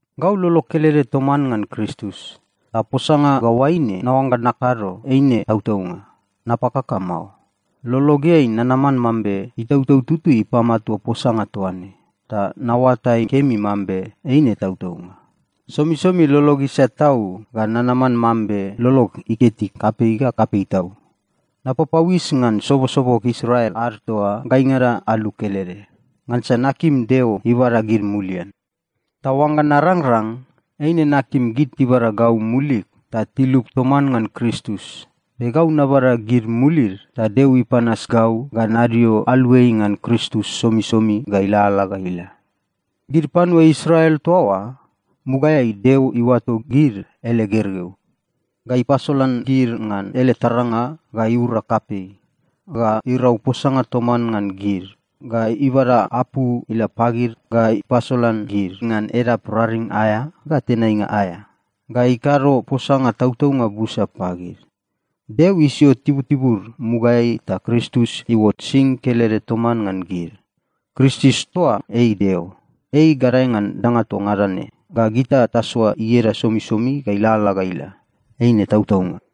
Gau lolog kelede toman ngan Kristus, ta posanga ga oaine naoangga nakado, eine tautaunga. Napakaka mao. Lologeai nanaman mambe Itautau Tutui ipamatua posanga toa ne, ta naoatai kemi mambe eine tautaunga. Somisomi lolog isat tau ga nanaman mambe lolog iketi kapei ga kapei tau. Napapauis ngan sobosobog Israel ad toa gaingada alu kelede, ngansa nakim Deo ibada gid mulian. Ta oangga narangrang, eine nakim gid tibada gau mulig ta tilup toman ngan Kristus, be gau nabada gid mulid ta Deo ipanas gau ga nadio aluai ngan Kristus somisomi ga ilalala ga ila. Gid panua Israel toa oa, mugaeai Deo iuato gid ele gergeu, ga ipasolan gid ngan ele taranga ga iura kapei, ga irau posanga toman ngan gid, ga ibada apu ila pagid, ga ipasolan gid ngan edap raring aea ga tenainga aea, ga ikado posanga tautaunga busa pagid. Deo isio tibutibud mugaeai ta Kristus iuot sing kelede toman ngan gid. Kristus toa ei Deo. Ei gadae ngan danga toa ngada ne, ga gita tasoa ieda somisomi ga ilalala ga ila. Eine tautaunga.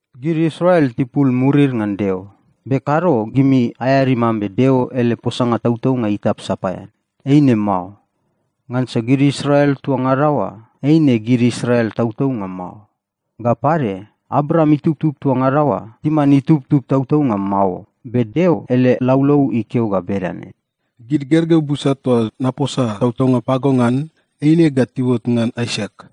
Gid Israel tipul murid ngan Deo, be kado gimi aeadi mambe Deo ele posanga tautaunga itap sapaean. Eine mao. Ngansa gid Israel toa ngada oa, eine gid Israel tautaunga mao. Ga pade, Abraam itubtub toa ngada oa timan itubtub tautaunga mao. Be Deo ele laulau ikeo ga bedane, “Gid gergeu busa toa naposa tautaunga pago ngan, eine ga tiuot ngan Aisak.”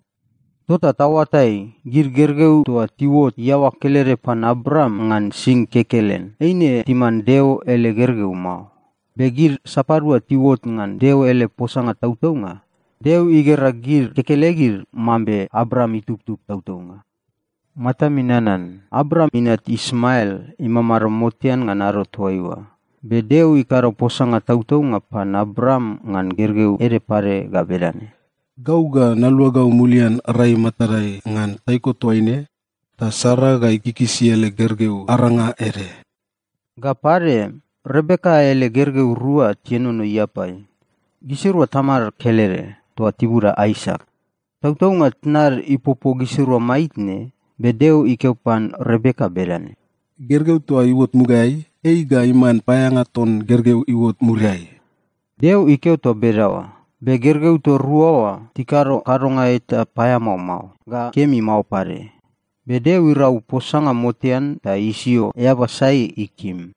Tota taoatai, gid gergeu toa tiuot iaoa kelede pan Abraam ngan sing kekelen, eine timan Deo ele gergeu mao. Be gid sapadua tiuot ngan Deo ele posanga tautaunga, Deo igera gid kekelegid mambe Abraam itubtub tautaunga. Matami nanan, Abraam inat Ismael imamado motean ngan ado toaiua, be Deo ikado posanga tautaunga pan Abraam ngan gergeu ede pade ga bedane, “Gau ga naluagau mulian rai matadai ngan taiko toaine, ta Sara ga ikikisi ele gergeu aranga ede.” Ga pade, Rebeka ele gergeu rua tienono iapai. Gisirua tamad kelede, toa tibuda Aisak. Tautaunga tnad ipopo gisirua maitne, be Deo ikeo pan Rebeka bedane, “Gergeu toa iuot mugaeai, ei ga iman paeaeanga ton gergeu iuot muriai.” Deo ikeo toa bedaoa, be gergeu toa rua oa tikado kadonga eta paeamao mao, ga kemi mao pade. Be Deo irau posanga motean ta isio eaba sai ikim.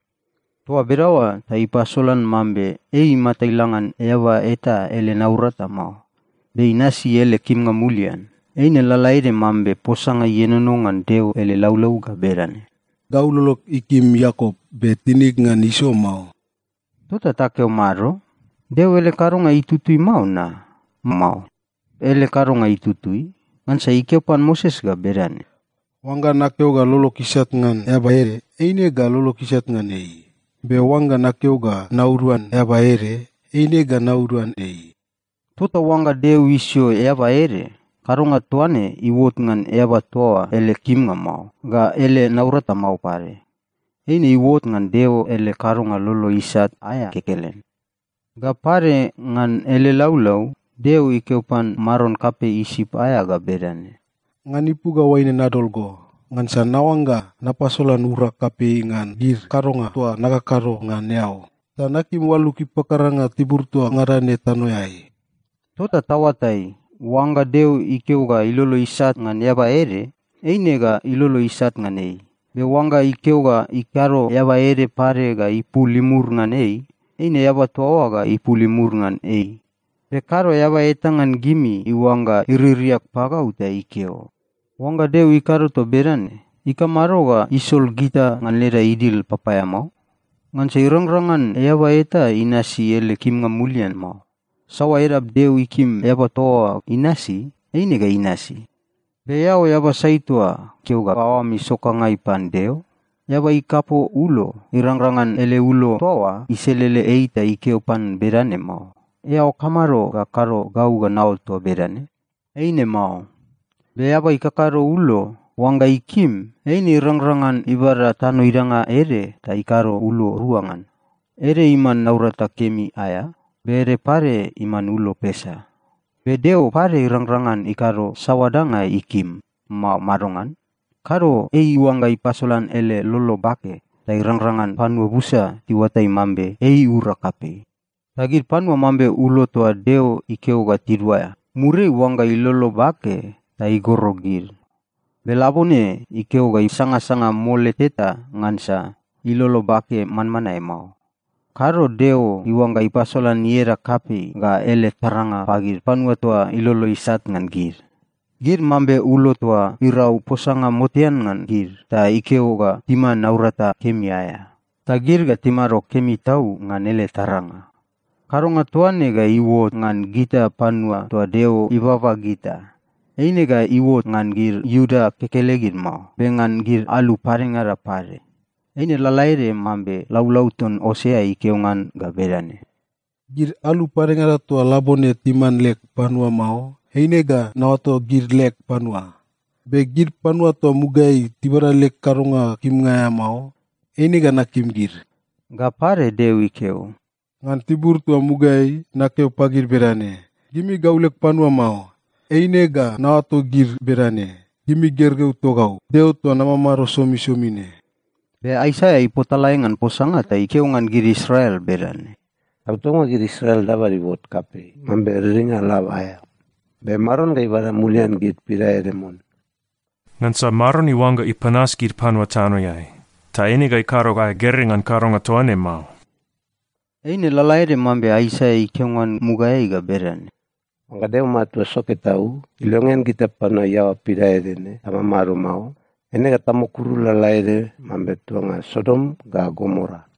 Toa bedaoa ta ipasolan mambe ei imata ila ngan eaba eta ele naurata mao, be inasi ele kimnga mulian. Eine lalaede mambe posanga ienono ngan Deo ele laulau ga bedane, “Gau lolog ikim Iakop, be tinig ngan Iso mao.” Tota takeo mado? Deo ele kadonga itutui mao na? Mao. Ele kadonga itutui. Ngansa ikeo pan Moses bedane, “Oangga nakeo ga lolog isat ngan eaba ede, eine ga lolog isat ngan ei. Be oangga nakeo ga nauduan eaba ede, eine ga nauduan ei.” Tota oangga Deo isio eaba ede, kadonga toa ne iuot ngan eaba toa oa ele kimnga mao, ga ele naurata mao pade. Eine iuot ngan Deo ele kadonga lolo isat aea kekelen. Ga pade, ngan ele laulau, Deo ikeo pan maron kapei Isip aea ga bedane, “Ngan ipu ga oaine nadol go, ngansa naoangga napasolan urag kapei ngan gid kadonga toa nakakado ngan eao, ta nakim oalug ipakaranga tibur toa ngada ne tanoeai.” Tota taoatai, oangga Deo ikeo ga ilolo isat ngan eaba ede, eine ga ilolo isat ngan ei. Be oangga ikeo ga ikado eaba ede pade ga ipul imur ngan ei, eine eaba toa oa ga ipul imur ngan ei. Be kado eaba eta ngan gimi iuangga iririak pagau ta ikeo, “Oangga Deo ikado toa bedane, ikamado ga isol gita ngan leda idil papaeamao? Ngansa irangrang ngan eaba eta inasi ele kimnga mulian mao. Saoa edap Deo ikim eaba toa oa inasi, eine ga inasi.” Be eao eaba sai toa keo ga aoam isokangai pan Deo? Eaba ikapo ulo, irangrang ngan ele ulo toa oa iselele ei ta ikeo pan bedane mao, “Eao kamado ga kado gau ga naot toa bedane?” Eine mao. Be eaba ikakado ulo, oangga ikim, eine irangrang ngan ibada tano idanga ede ta ikado ulo rua ngan. Ede iman naurata kemi aea, be ede pade iman ulo pesa. Be Deo pade irangrang ngan ikado saoa danga ikim, mao madongan? Kado ei iuangga ipasolan ele lolo bake ta irangrang ngan panua busa tiuatai mambe ei iura kapei. Ta gid panua mambe ulo toa Deo ikeo ga tiduaea, muriai iuangga ilolo bake ta igoro gid. Be labone ikeo ga isangasanga mole teta ngansa ilolo bake manmanae mao. Kado Deo iuangga ipasolan ieda kapei ga ele taranga pagid panua toa ilolo isat ngan gid. Gid mambe ulo toa irau posanga motean ngan gid, ta ikeo ga timan naurata kemi aea. Ta gid ga timado kemi tau ngan ele taranga. Kadonga toa ne ga iuot ngan gita panua toa Deo ibaba gita. Eine ga iuot ngan gid Iuda kekelegid mao, be ngan gid alu padengada pade. Eine lalaede mambe laulau ton Osea ikeo ngan ga bedane, “Gid alu padengada toa labone timan leg panua mao, eine ga naoato gid leg panua. Be gid panua toa mugaeai tibada leg kadonga kimnga aea mao, eine ga nakim gid.” Ga pade Deo ikeo, “Ngan tibur toa mugaeai nakeo pagid bedane, ‘Gimi gau leg panua mao,’ eine ga naoato gid bedane, ‘Gimi gergeu togau, Deo toa namamado somisomi ne.’” Be Aisaia ipotalae ngan posanga ta ikeo ngan gid Israel bedane, “Tautaunga gid Israel dabad iuot kapei mambe riringa lab aea, be Maron ga ibada mulian gid pidaede mon. Ngansa Maron iuangga ipanas gid panua tanoeai, ta eine ga ikado aea gerei ngan kadonga toa ne mao.” Eine lalaede mambe Aisaia ikeo ngan mugaeai ga bedane, “Oangga Deo Matua Soke Tau ilongean gita panua iaoa pidaede ne tamamado mao, eine ga tamukuru lalaede mambe tuanga Sodom ga Gomora.”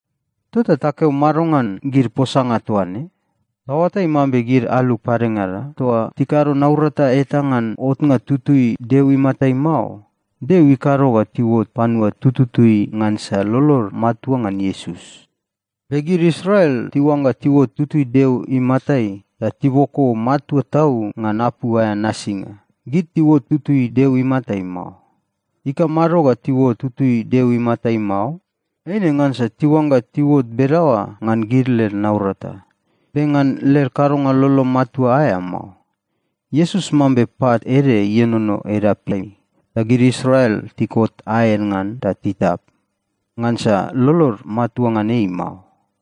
Tota takeo mado ngan gid posanga toa ne? Taoatai mambe gid alu padengada toa tikado naurata eta ngan otnga tutui Deo imatai mao, Deo ikado ga tiuot panua tututui ngansa lolod matua ngan Iesus. Be gid Israel tiuangga tiuot tutui Deo imatai, ta tiboko matua tau ngan apu aea nasinga, gid tiuot tutui Deo imatai mao. Ikamado ga tiuot tutui Deo imatai mao? Eine ngansa tiuangga tiuot bedaoa ngan gid led naurata, be ngan led kadonga lolo matua aea mao. Iesus mambe pat ede ienono edapeai. Ta gid Israel tikot aed ngan ta titap, ngansa lolod matua ngan ei mao.